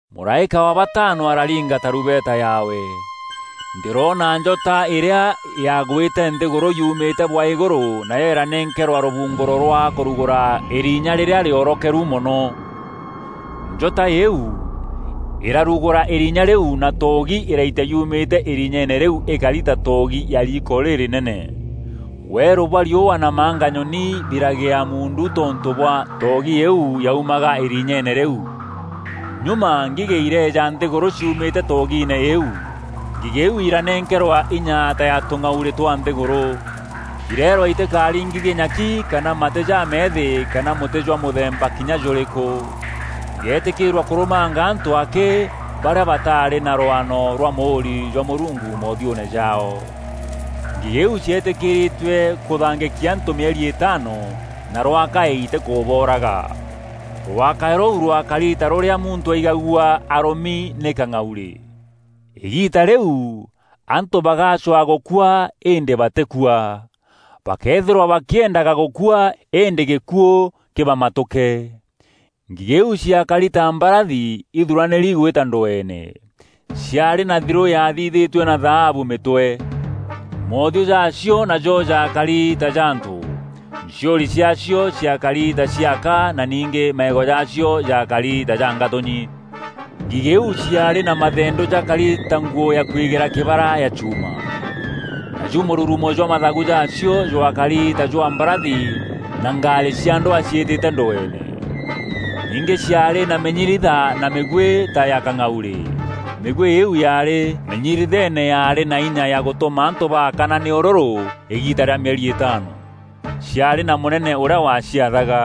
Mûraîka wa batano araringa tarumbeta yaawe. Ndîroona njota îrîa yaagwîte nthîgûrû yumîte bwa îgûrû nayo îranenkerwa rûbungûro rwa kûrugûra îrinya rîrîa rîoorokeru mono. Njota îîu îrarugûra îrinya rîu na toogi îraitia yumîte îrinyeene rîu îkari ta toogi ya riiko rîrînene. Weerû bwa riûa na manganyoni biragea muundu tontû bwa toogi îîu yaumaga îrinyeeene rîu. Nyuma ngigî ireeja nthîgûrû ciumîte toogiine îîu. Ngigî iu iranenkerwa inya ta ya tûng'aurî twa nthîgûrû. Ireerwa itîkaringithie nyaki kana matî jameethî kana mûtî jwa mûthemba kinya jûrîkû. Ireetîkîîrua kûrûmanga antû akî barîa bataarî na rwano rwa mûûri jwa Mûrungu moothiûûne jaao. Ngigî iu cietîkîrîtue kûthangîkia antû mîeri îtaano na rwakaî îtîkûbooraga. Rwakaî rûu rwakari ta rûrîa muntû aigagua arûmi nî kang'aurî. Îgiita rîu, antû bagacwaa gûkua îndî batîkua. Bakeethîrwa bakîendaga gûkua îndî gîkuû kîbamatûke. Ngigî iu ciaakari ta mbarathi ithuranîri gwîta ndweene. Ciaarî na thirû yaathithîtue na thaabu mîtwe. Moothiû jaacio najo jakari ta ja antû, nchiûri ciaacio ciaakari ta cia aka na ningî maîgo jaacio jaakari ta ja ngatûnyi. Ngigî iu ciaarî na mathendû jakari ta nguû ya kwigîra kîbara ya chuuma. Naju mûrurumo jwa mathagu jaacio jwakari ta jwa mbarathi na ngarî cia ndwaa ciîtîte ndweene. Ningî ciaarî na mînyiritha na mîgwî ta ya kang'aurî. Mîgwî îîu yaarî mînyiritheene yaarî na inya ya gûtûma antû baakana nî ûrûrû îgiita rîa mîeri îtaano. Ciaarî na mûnene ûrîa waciathaga.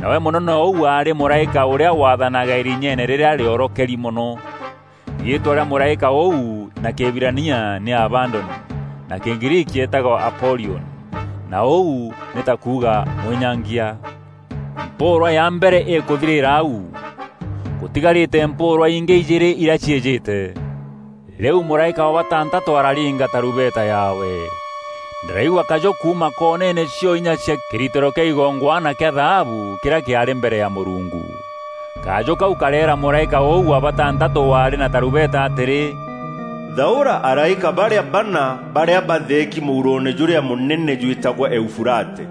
Nawe mûnene ûu aarî mûraîka ûrîa waathanaga îrinyeene rîrîa rîoorokeri mono. Riîtwa rîa mûraîka ûu na Kîhibirania nî Abadoni, na Kîgriiki eetagwa Apolioni, na ûu nî ta kuuga “Mwînyangia.” Mpûûrwa ya mbere îkûthirîîra au. Gûtigarîte mpûûrwa ingî ijîîrî irîa ciîjîte. Rîu mûraîka wa batantatû araringa tarumbeta yaawe. Ndîraigua kajû kuuma koneene cio inya cia kîritîro kîa igongwana kîa thaabu kîrîa kîaarî mbere ya Mûrungu. Kajû kau kareera mûraîka ûu wa batantatû waarî na tarumbeta atîrî, “Thaûra araîka barîa bana barîa batheeki mûuroone jûrîa mûnene jwîtagwa Eufurate.”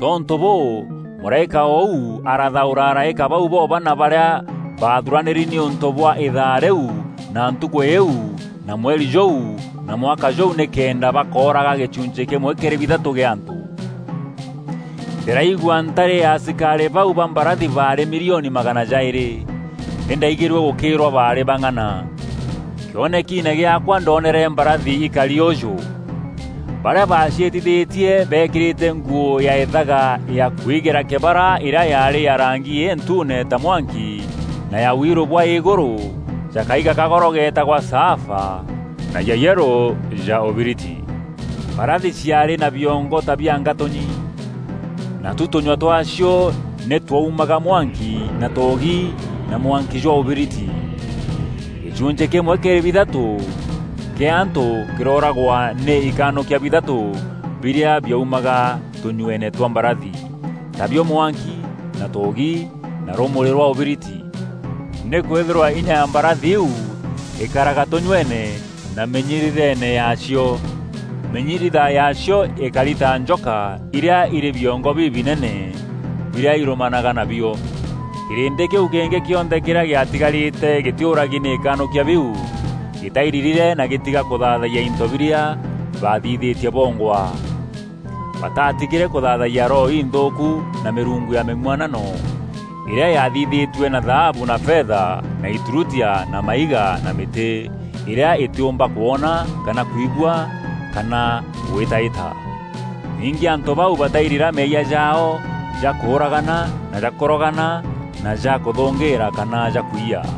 Tontû bûû mûraîka ûu arathaûra araîka bau bo bana barîa baathuranîri nîûntû bwa îthaa rîu na ntukû îîu na mweri jûu na mwaka jûu nîkenda bakooraga gîchunchî kîmwe kîrî bithatû kîa antû. Ndîraigua ntari ya asikarî bau ba mbarathi baarî milioni magana jaîrî. Nî ndaigîrue gûkîrwa baarî bang'ana. Kîonekiine gîaakwa ndonere mbarathi îkari ûûjû: Barîa baciîtithîtie beekîrîte nguû ya îthaga ya kwigîra kîbara îrîa yaarî ya rangi întuune ta mwanki na ya wiirû bwa îgûrû ja kaiga ka goro geetagwa Saafa, na ya yerû ja ûbiriti. Mbarathi ciaarî na biongo ta bia ngatûnyi. Natu tûnyua twaacio nî twaumaga mwanki na toogi na mwanki jwa ûbiriti. Gîchunchî kîmwe kîrî bithatû kîa antû kîrooragwa nî ikanûkia bithatû birîa biaumaga tûnyueene twa mbarathi; tabio mwanki na toogi na rûmûrî rwa ûbiriti. Nîkwîthîrwa inya ya mbarathi iu îkaraga tûnyueene na mînyiritheene yaacio. Mînyiritha yaacio îkari ta njoka irîa îrî biongo bibinene, birîa îrûmanaga nabio. Kîrîndî kîu kîngî kîonthe kîrîa gîatigarîte gîtîûragi nî ikanûkia biu, gîtairirîre na gîtiga kûthaathayia into birîa baathithîtie bongwa. Bataatigîre kûthaathayia roho inthûûku na mîrungu ya mîng'uanano îrîa yaathithîtue na thaabu na fetha na îturutia na maiga na mîtî, îrîa îtîûmba kwona kana kwigua kana gwîtaîta. Ningî antû bau batairira meeyia jaao ja kûûragana na ja kûrogana na ja kûthûngîîra kana ja kwiyia.